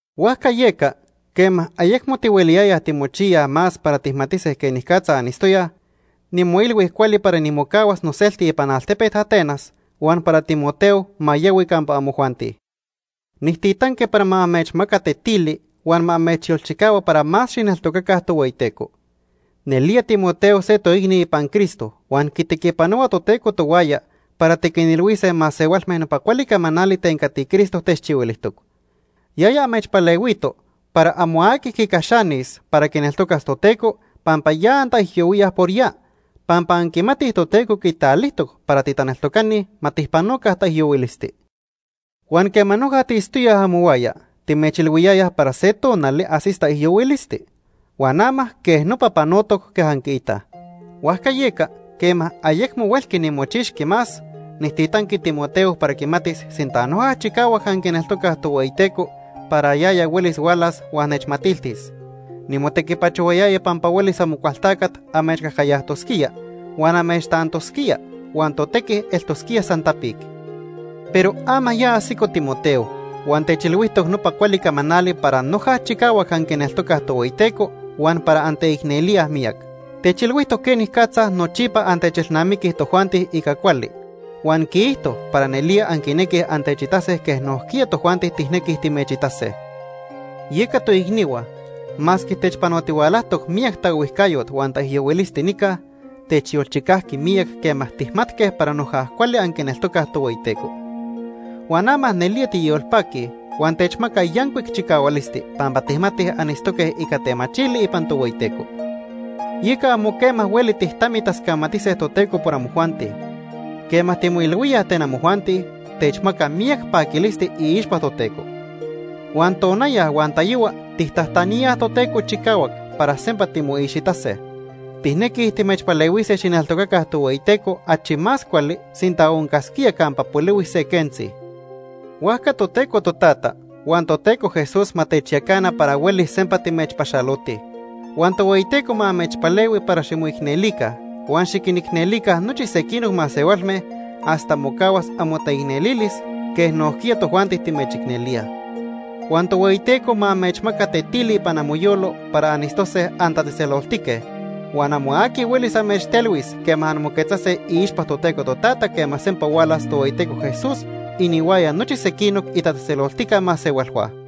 Huajca yeca, quema ayecmo tihueliyayaj timochiyaj más para tijmatise quenicatza anitztoyaj, nimoilhui cuali para nimocahuas noselti ipan altepet Atenas, huan para Timoteo ma yahui campa amojuanti. Nijtitanqui para ma amechmaca tetili huan ma amechyolchicahua para más xijneltocaca Tohueyiteco. Nelía Timoteo se toicni ipan Cristo huan quitequipanohua Toteco tohuaya para tiquinilhuise masehualme nopa cuali camanali ten cati Cristo techchihuilijtoc. Yaya amechpalehuito para amo aqui quicaxanis para quineltocas Toteco pampa ya antaijyohuíaj por ya, pampa anquimatij Toteco quitalijtoc para titaneltocani ma tijpanoca taijyohuilisti. Huan quema noja tiitztoyaj amohuaya, timechilhuiyayaj para se tonali ajsis taijyohuilisti. Huan ama quej nopa panotoc quej anquiitaj. Huajca yeca, quema ayecmo huelqui nimochixqui más, nijtitanqui Timoteo para quimatis sinta noja chicahuac anquineltocaj Tohueyiteco para yaya huelis hualas huan nechmatiltis. Nimotequipachohuayaya pampa huelis Amocualtacat amechcajcayajtosquía huan amechtantosquía, huan totequi eltosquía san tapic. Pero ama ya ajsico Timoteo, huan techilhuijtoc nopa cuali camanali para noja chicahuac anquineltocaj Tohueyiteco huan para anteicnelíaj miyac. Techilhuijtoc quenicatza nochipa antechelnamiquij tojuanti ica cuali, huan quiijto para nelía anquinequij antechitase quej nojquiya tojuanti tijnequij timechitase. Yeca toicnihua, masque techpanotihualajtoc miyac taohuijcayot huan taijyohuilisti nica, techyolchicajqui miyac quema tijmatque para noja cuali anquineltocaj Tohueyiteco. Huan ama nelía tiyolpaquij huan techmaca yancuic chicahualisti pampa tijmatij anitztoque ica temachili ipan Tohueyiteco. Yeca amo quema hueli tijtamitascamatise Toteco por amojuanti. Quema timoilhuíaj ten amojuanti, techmaca miyac paquilisti iixpa Toteco. Huan tonaya huan tayohua tijtajtaníaj Toteco chicahuac para sempa timoixitase. Tijnequij timechpalehuise xijneltocaca Tohueyiteco achi más cuali sinta oncasquía campa polihui se quentzi. Huajca Toteco Totata huan Toteco Jesús ma techyacana para huelis sempa timechpaxalotij. Huan Tohueyiteco ma amechpalehui para ximoicnelica huan xiquinicnelica nochi sequinoc masehualme hasta mocahuas amotaicnelilis, quej nojquiya tojuanti timechicnelíaj. Huan Tohueyiteco ma amechmaca tetili ipan amoyolo para anitztose antatzejtzeloltique, huan amo aqui huelis amechtelhuis quema anmoquetzase iixpa Toteco Totata quema sempa hualas Tohueyiteco Jesús inihuaya nochi sequinoc itatzejtzeloltica masehualhua.